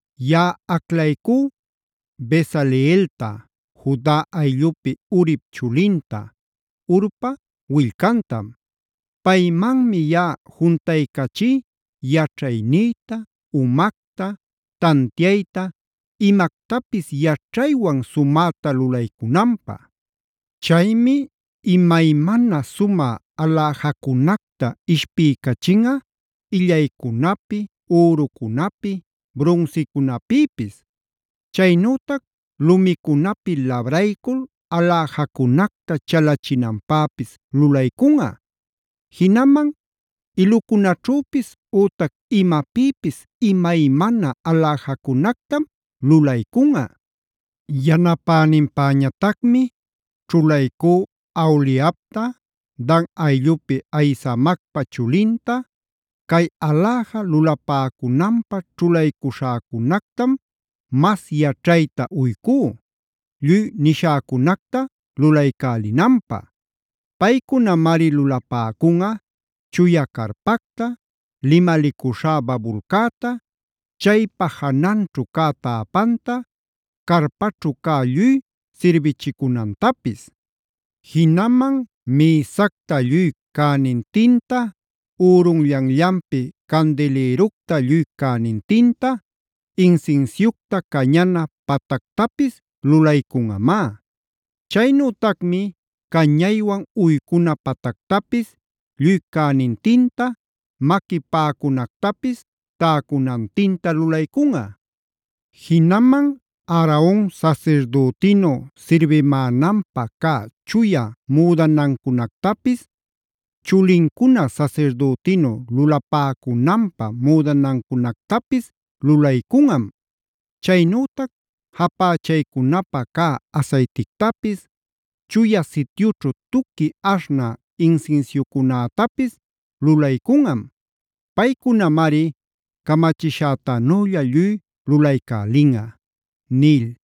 “Yaꞌa aclaycú Bezaleelta, Juda ayllupi Urip chulinta, Hurpa willcantam. Paymanmi yaꞌa juntaycachí yaćhaynïta, umacta, tantiayta, imactapis yaćhaywan sumäta lulaycunanpä. Chaymi imaymana sumä aläjacunacta ishpiycachinꞌa illaycunapi, ürucunapi, brunsicunapïpis. Chaynütac lumicunapi labraycul aläjacunacta chalachinanpäpis lulaycunꞌa. Jinaman ilucunaćhüpis, ütac imapïpis imaymana aläjacunactam lulaycunꞌa. Yanapäninpäñatacmi ćhulaycú Aholiabta, Dan ayllupi Ahisamacpa chulinta. Cay aläja lulapäcunanpä ćhulaycuśhäcunactam mas yaćhayta uycú, lluy nishäcunacta lulaycälinanpä. Paycunamari lulapäcunꞌa: chuya carpacta, limalicuśhá babulcäta, chaypa jananćhu cä täpanta, carpaćhu cä lluy sirbichicunantapis. Jinaman mïsacta lluy cänintinta, ürunllanllanpi candilïructa lluy cänintinta, insinsiucta cañana patactapis lulaycunꞌamá. Chaynütacmi cañaywan uycuna patactapis lluy cänintinta, maqui paꞌacunactapis täcunantinta lulaycunꞌa. Jinaman Aaron sasirdütinu sirbimänanpä cä chuya müdanancunactapis, chulincuna sasirdütinu lulapäcunanpä müdanancunactapis lulaycunꞌam. Chaynütac japächaycunapä cä asaytictapis, Chuya Sityućhu tuqui aśhnä insinsiucunätapis lulaycunꞌam. Paycunamari camachishätanülla lluy lulaycälinꞌa” nil.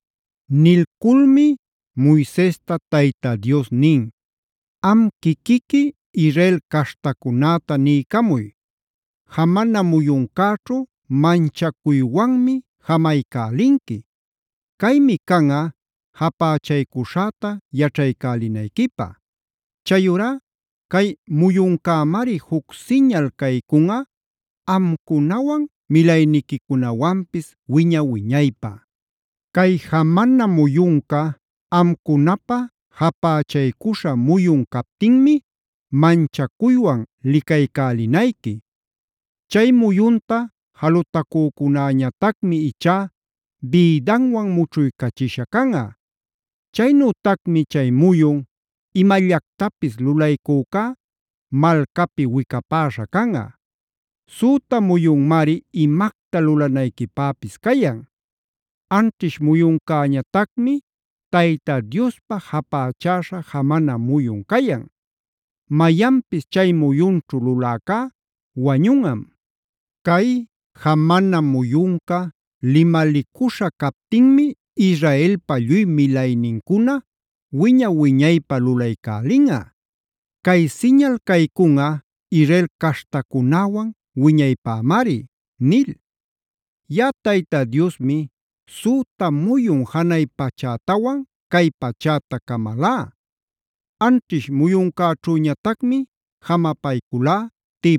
Nilculmi Moisesta Tayta Dios nin: “Am quiquiqui Israel caśhtacunäta niycamuy: ‘Jamana muyuncäćhu manchacuywanmi jamaycälinqui. Caymi canꞌa japächaycuśhäta yaćhaycälinayquipä. Chayurá cay muyuncämari juc siñal caycunꞌa amcunawan milayniquicunawanpis wiña-wiñaypä. Cay jamana muyunca amcunapä japächaycuśhä muyun captinmi manchacuywan licaycälinayqui. Chay muyunta jalutacücunäñatacmi ichá bïdanwan mućhuycachisha canꞌa. Chaynütacmi chay muyun imallactapis lulaycücá malcapi wicapäśha canꞌa. Süta muyunmari imacta lulanayquipäpis cayan. Anćhish muyuncäñatacmi Tayta Diospa japächäśha jamana muyun cayan.a Mayanpis chay muyunćhu luläcá wañunꞌam. Cay jamana muyunca limalicuśhä captinmi Israelpa lluy milaynincuna wiña-wiñaypä lulaycälinꞌa. Cay siñal caycunꞌa Israel caśhtacunäwan wiñaypämari’ nil. Yaꞌa Tayta Diosmi süta muyun janay pachätawan cay pachäta camalá. Anćhish muyuncäćhüñatacmi jamapayculá,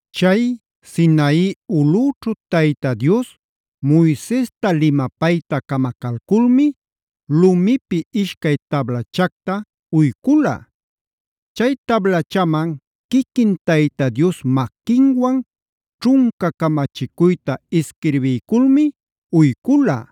Chay Sinai ulꞌüćhu Tayta Dios Moisesta limapayta camacalculmi lumipi ishcay tablachacta uycula. Chay tablachaman quiquin Tayta Dios maquinwan ćhunca camachicuyta isquirbiyculmi uycula.